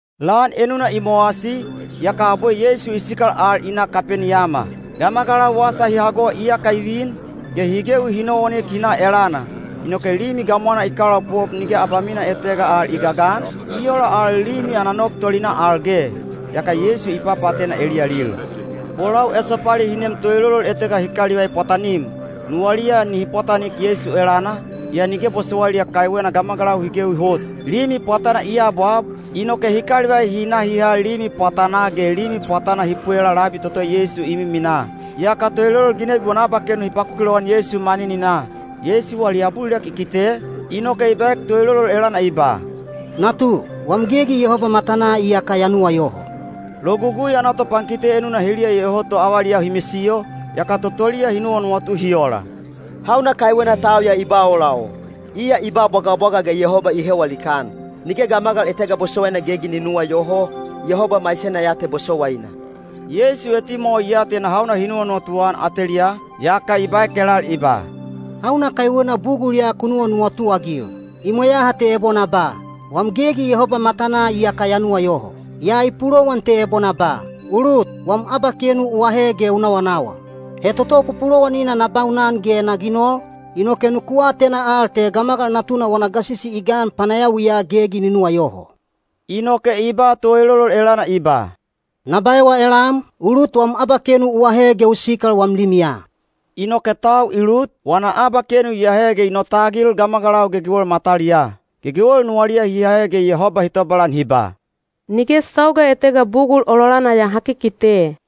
Lan enuna i mowasi, yaka abwe Yeisu i sikal al i na Kapeniyama. Gamagalau wasa hi hago iyaka i vin, ge hi gewi hi nowanik hi na elana. Inoke limi gamwana i kalaopop nige abamina etega al i gagan, i ola al limi ana nog tolinaa al ge. Yaka Yeisu i papaatena eliyalil. Bolau esopali hi nem toelolol etega hi kalivai pwatanim. Nuwaliya nihi pwatanik Yeisu elana, yaa nige bosowailiya kaiwena gamagalau hi gewi hot. Limi pwatana i abwab, inoke hi kalivai hi na hi ha limi pwatanaa ge limi pwatana hi pwelaa labi toto Yeisu i miminaa. Yaka toelolol ginebi wana abakenu hi pakuki lowan Yeisu manininaa. Yeisu wali abulilek i kite, inoke i baek toelolol elana i ba, “Natu, wam gegi Yehoba matanaa iyaka ya nuwayoho.” Logugui ana topankite enuna heliya iyoho to avaliyau hi misiyo, yaka totoliya hi nuwanuwatu hi ola, “Hauna kaiwena tau ya i ba ola o? Iya i ba bwagabwaga ge Yehoba i hewa likaan! Nige gamagal etega bosowaina gegi ni nuwayoho, Yehoba maisena ya te bosowaina.” Yeisu etimwawa i atena hauna hi nuwanuwatu-an ateliyaa, yaka i baek elal i ba, “Hauna kaiwena bugul ya ku nuwanuwatu-agil? I mweyaha te ebo na ba, ‘Wam gegi Yehoba matanaa iyaka ya nuwayoho.’ Yaa i pulowan te ebo na ba, ‘U lut, wam abakenu u ahe ge u nawanawa.’ He toto pupulowanina na baunan ge na ginol, inoke nuku atena al te Gamagal Natuna wana gasisi i gan panayawiya gegi ni nuwayoho.” Inoke i ba toelolol elana i ba, “Na baewa elam, u lut wam abakenu u ahe ge u sikal wam limiya.” Inoke tau i lut, wana abakenu i ahe ge i notagil gamagalau gegewel mataliyaa. Gegewel nuwaliya hi ahe ge Yehoba hi tobalan hi ba, “Nige sauga etega bugul ololana ya ha kikite.”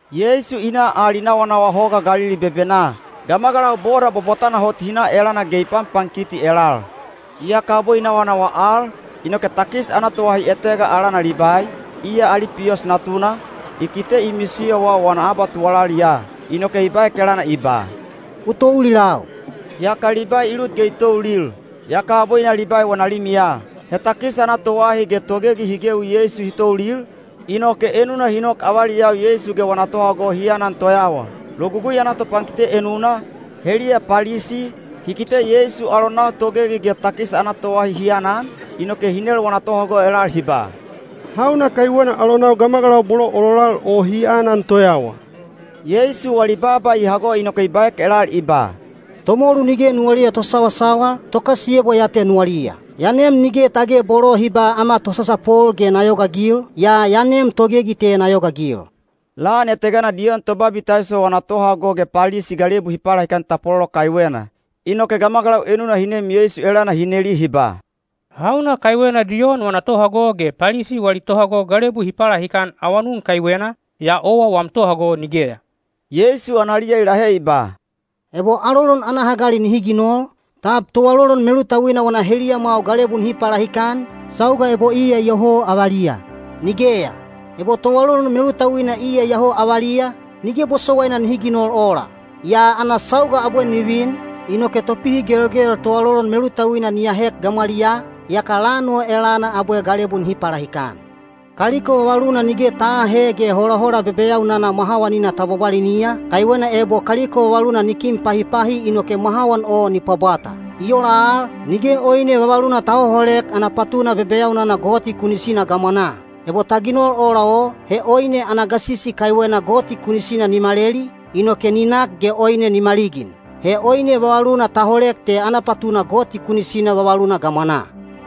Yeisu i na al i nawanawa Hoga Galili bebenaa. Gamagalau boda bwabwatana hot hi na elana ge i panpankiti elal. Yaka abwe i nawanawa al, inoke takis ana toahi etega alana Libai, iya Alipiyos natuna, i kite i misiyowa wana abatuwalaliya. Inoke i baek elana i ba, “U toulilau.” Yaka Libai i lut ge i toulil. Yaka abwe i na Libai wana limiya. He takis ana toahi ge togegi hi gewi Yeisu hi toulil, inoke enuna hi nok avaliyau Yeisu ge wana tohago hi anan toyawa. Logugui ana topankite enuna, heliya Palisi, hi kite Yeisu alonau togegi ge takis ana toahi hi anan, inoke hi nel wana tohago elal hi ba, “Hauna kaiwena alonau gamagalau bolo ololal o hi anan toyawa?” Yeisu wali baaba i hago inoke i baek elal i ba, “Tomolu nige nuwaliya tosawasawal, tokasiyebwa ya te nuwaliya. Ya nem nige tage bolo hi ba ‘Ama tosasapol’ ge na yogaagil, yaa ya nem togegi te na yogaagil.” Lan etegana Diyon Tobabitaiso wana tohago ge Palisi galebu hi palahikan tapwalolo kaiwena. Inoke gamagalau enuna hi nem Yeisu elana hi neli hi ba, “Hauna kaiwena Diyon wana tohago ge Palisi wali tohago galebu hi palahikan awanun kaiwena, yaa owa wam tohago nigeya?” Yeisu analiya i lahe i ba, “Ebo alolon ana hagali nihi ginol, tab toalolon melutauina wana heliyamwau galebu nihi palahikan, sauga ebo iya iyoho avaliya? Nigeya! Ebo toalolon melutauina iyoho avaliya, nige bosowaina nihi ginol ola. Yaa ana sauga abwe ni vin, inoke topihigelgel toalolon melutauina ni ahek gamwaliyaa, yaka lan o elana abwe galebu nihi palahikan. Kaliko vavaluna nige ta aahe ge holahola bebeyaunana mwahawanina ta bwabwaliniya, kaiwena ebo kaliko vavaluna ni kin pahipahi inoke mwahawan o ni pwabwata. I ola al, nige oine vavaluna ta hoholek ana patuna bebeyaunana gamwanaa toto goti kunisina hi ginoliya. Ebo ta ginol ola o, he oine ana gasisi kaiwena goti kunisina ni maleli, inoke ni nak ge oine ni maligin. He oine vavaluna ta holek te ana patuna vavaluna gamwanaa toto goti kunisina hi ginoliya.”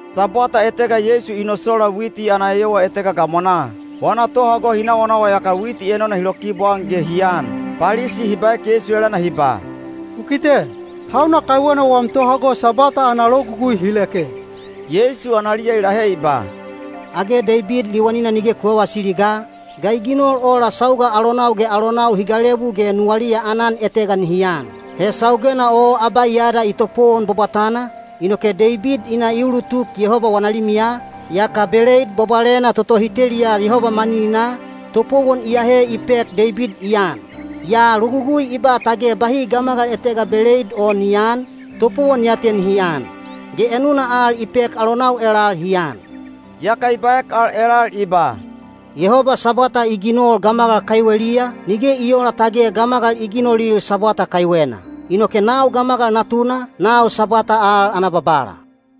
Sabwata etega Yeisu i nosola witi ana eyowa etega gamwanaa. Wana tohago hi nawanawa yaka witi enona hi lokibwaan ge hi an. Palisi hi baek Yeisu elana hi ba, “U kite, hauna kaiwena wam tohago Sabwata ana logugui hi leke?” Yeisu analiya i lahe i ba, “Age Deibid liwanina nige ku vavasili ga, ga i ginol ola sauga alonau ge alonau hi galebu ge nuwaliya aanan etega nihi an? He saugena o Abaiyada i topowon bwabwatana, inoke Deibid i na i ulutuk Yehoba wana limiya, yaka beleid bwabwalena toto hi teliya Yehoba manininaa, topowon i ahe i pek Deibid i an. Yaa logugui i ba tage bahi gamagal etega beleid o ni aan, topowon ya te nihi an. Ge enuna al i pek alonau elal hi an.” Yaka i baek al elal i ba, “Yehoba Sabwata i ginol gamagal kaiweliya, nige i oola tage gamagal i ginolil Sabwata kaiwena. Inoke nau Gamagal Natuna, nau Sabwata al ana Babala.”